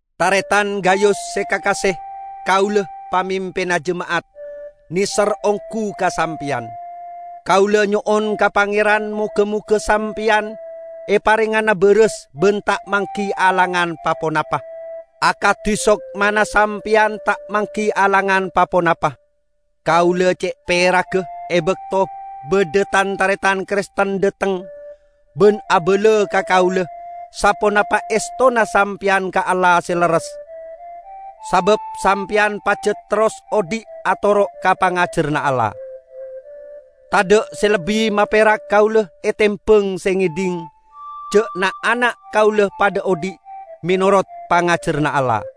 Taretan Gayus se kakase! Kaula, pamimpinna jema'at, neser onggu ka sampeyan; kaula nyo'on ka Pangeran moga-moga sampeyan eparengngana baras ban ta' manggi alangan pa-ponapa, akadi sokmana sampeyan ta' manggi alangan pa-ponapa. Kaula ce' peragga e bakto badha tan-taretan Kristen dhateng ban abala ka kaula saponapa estona sampeyan ka Allah se lerres, sabab sampeyan pajat terros odhi' atoro' ka pangajaranna Allah. Tadha' se lebbi maperak kaula etembang se ngedhing ja' na'-ana' kaula padha odhi' menorot pangajaranna Allah.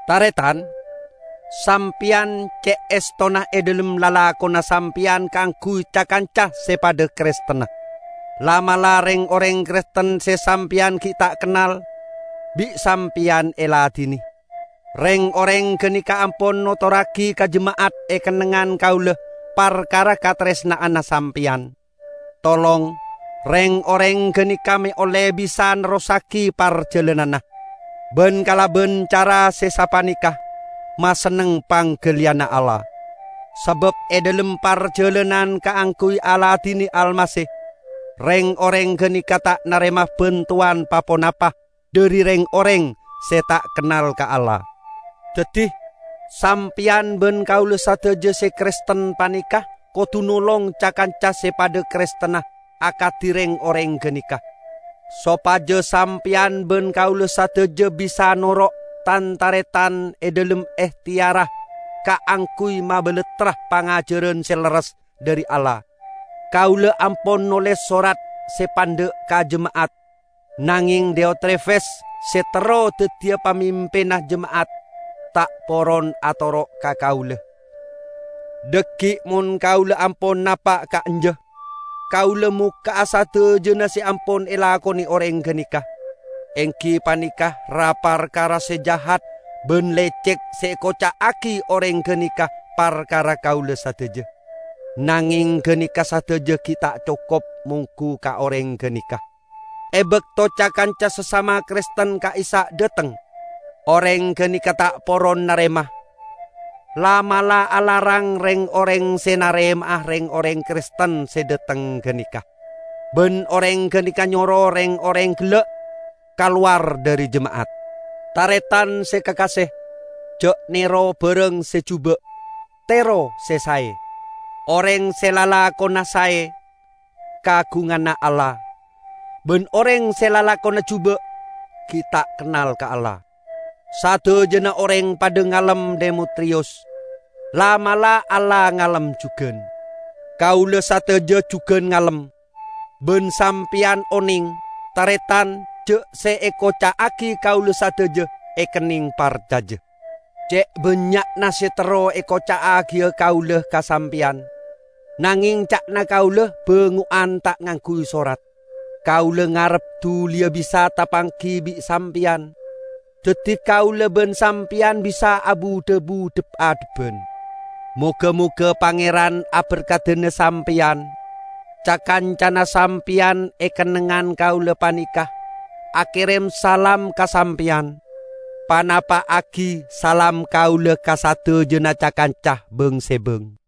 Taretan! Sampeyan ce' estona e dhalem lalakonna sampeyan kaangguy ca-kanca se padha Kristenna; la'-mala' reng-oreng Kristen se sampeyan gi' ta' kennal, bi' sampeyan eladine. Reng-oreng ganeka ampon notorragi ka jema'at e kennengngan kaula parkara kataresna'anna sampeyan. Tolong reng-oreng ganeka me' olle bisa nerrossagi parjalananna, ban kalaban cara se sapaneka masenneng panggaliyanna Allah, sabab e dhalem parjalanan kaangguy aladine Almasih, reng-oreng ganeka ta' narema bantowan pa-ponapa dhari reng-oreng se ta' kennal ka Allah. Daddi, sampeyan ban kaula sadaja se Kristen paneka kodu nolong ca-kanca se padha Kristenna akadi reng-oreng ganeka, sopaja sampeyan ban kaula sadaja bisa noro' tan-taretan e dhalem ehteyarra kaangguy mabalattra pangajaran se lerres dhari Allah. Kaula ampon noles sorat se pandha' ka jema'at, nangeng Diotrefes se terro daddiya pamimpinna jema'at, ta' poron atoro' ka kaula. Dhaggi' mon kaula ampon napa' ka'anja, kaula mokka'a sadajana se ampon elakone oreng ganeka, enggi paneka ra-parkara se jahat ban lecek se ekoca'agi oreng ganeka parkara kaula sadaja! Nangeng ganeka sadaja gi' ta' cokop monggu ka oreng ganeka. E bakto ca-kanca sasama Kristen ka'issa' dhateng, oreng ganeka ta' poron narema. La'-mala' alarang reng-oreng se narema'a reng-oreng Kristen se dhateng ganeka, ban oreng ganeka nyoro reng-oreng gella' kalowar dhari jema'at! Taretan se kakase, ja' nero barang se juba'. Tero se sae. Oreng se lalakonna sae, kaagunganna Allah. Ban oreng se lalakonna juba' gi' ta' kennal ka Allah. Sadajana oreng padha ngalem Demetriyus. La'-mala' Allah ngalem jugan. Kaula sadaja jugan ngalem, ban sampeyan oneng, taretan, ja' se ekoca'agi kaula sadaja ekenneng parcaja. Ce' bannya'na se terro ekoca'agiya kaula ka Sampeyan, nangeng ca'na kaula bango'an ta' ngangguy sorat. Kaula ngarep duliya bisa tapanggi bi' sampeyan, daddi kaula ban sampeyan bisa abu-dhabu dhep-adhebban. Moga-moga Pangeran aberkadana sampeyan. Ca-kancana sampeyan e kennengngan kaula paneka akerem salam ka sampeyan. Panapa'agi salam kaula ka sadajana ca-kanca bang-sebang.